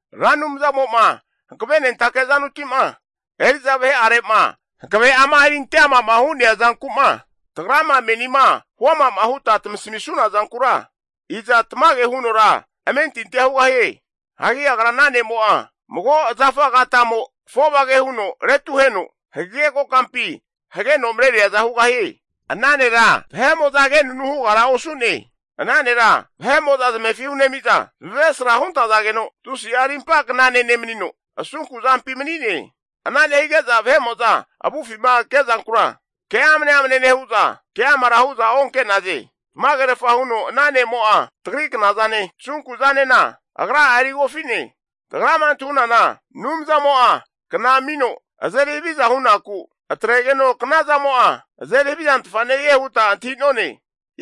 Ra Anumzamo'ma hankavenentake azanuti'ma eri'za vahe'are'ma hankave'ama erinte ama'ma hu'nea zanku'ma, tagrama menima huama'ma huta tamasamisuna zankura, iza tamage hunora amentintia hugahie? Hagi agra ana ne'mo'a, mago zafa agatamo avofage huno retuheno hagege kokampi hageno mareriaza hugahie. Ana nera vahe'mo'za agenunu hugara osu'ne. Ana nera vahe'mo'za zamefi hunemi'za, zamavesra huntazageno, tusi'a rimpa knane nemanino, asunku zampi mani'ne. Ana nehige'za vahe'mo'za avufima ke'zankura ke amne amne nehu'za keamara hu'za onke'naze. Tamagerfa huno ana ne'mo'a tagri knazane, tasunku zanena agra'a erigofi'ne. Tagrama antahunana Anumzamo'a kna amino azeri haviza hunaku atregeno knazamo'a azeri havizantfa nehie huta antahi'none.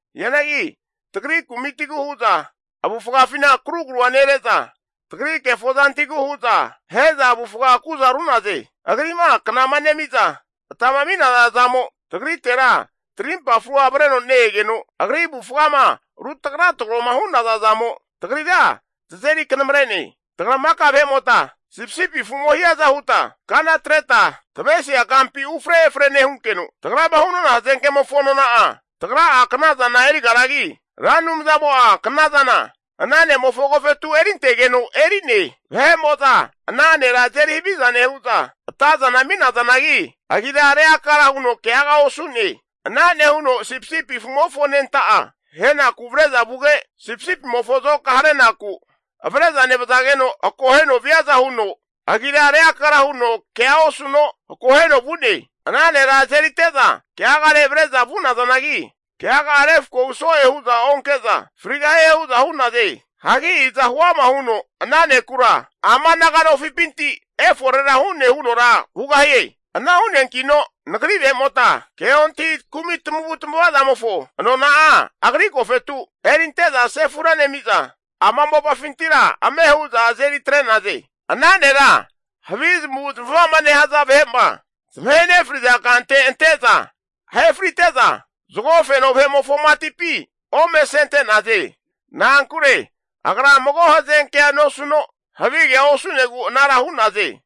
Hianagi tagri kumitigu hu'za avufagafina karugrua nere'za, tagri kefo zantigu hu'za ahe'za avufga agu'za ru'naze. Agri'ma kanama nemi'za, atama ami'naza zamo tagritera tarimpa frua avreno ne-egeno, agri avufgama rutraga trago'ma hu'naza zamo, tagrira tazeri kanamre'ne. Tagra maka vahe'mota sipisipi afu'mo hiaza huta kana atreta, tavesia kampi ufre efre nehunkeno, tagrama hu'nona hazenke'mofo nona'a, tagra'a knazana erigaragi, Ra Anumzamo'a knazana ana ne'mofo agofetu erintegeno eri'ne. Vahe'moza ana nera azeri haviza nehu'za, atazana ami'nazanagi agira reakara huno keaga osu'ne. Ana nehuno sipisipi afumofo anenta'a ahenaku avre'za vuge, sipisipimofo azoka harenaku avre'za nevazageno akoheno viaza huno agira reakara huno kea osuno akoheno vu'ne. Ana nera azerite'za keagare avre'za vu'nazanagi, keaga'a refkohu so'e hu'za onke'za frigahie hu'za hu'naze. Hagi iza huama huno ana nekura ama naga nofipinti eforera hu'ne hunora hugahie? Ana hu'neankino nagri vahe'mota ke ontahi kumi tamavutamava zamofo nona'a agri agofetu erinte'za sefura nemi'za, ama mopafintira ame hu'za azeri atre'naze. Ana nera havi zamavu zamava'ma nehaza vahe'ma zamahe nefri'za kante ante'za ahe friteza, zago feno vahe'mofo matipi ome asente'naze. Na'ankure agra mago hazenkea nosuno havigea osu'negu anara hu'naze.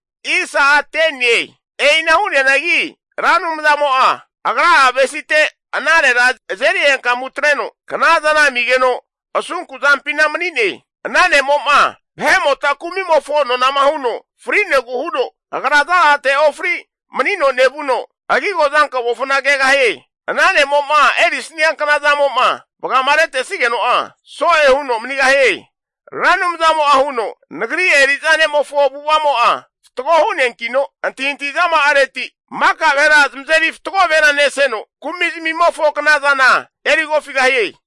E'ina hu'neanagi Ra Anumzamo'a Agra'a avesite ana nera azeri henkamu atreno knazana amigeno asunkuzampina mani'ne. Ana ne'mo'ma vahe'mota kumimofo nonama huno frinegu huno agra zazate ofri manino nevuno, agigo azankomofona kegahie. Ana ne'mo'ma erisnia knazamo'ma vagama retesigeno'a, so'e huno manigahie. Ra Anumzamo'a huno Nagri eri'za ne'mofo avu'avazamo'a fatgo hu'neankino, antahintahi zama'areti maka vahera zamazeri fatgo vahera neseno, kumi zamimofo knazana erigofigahie.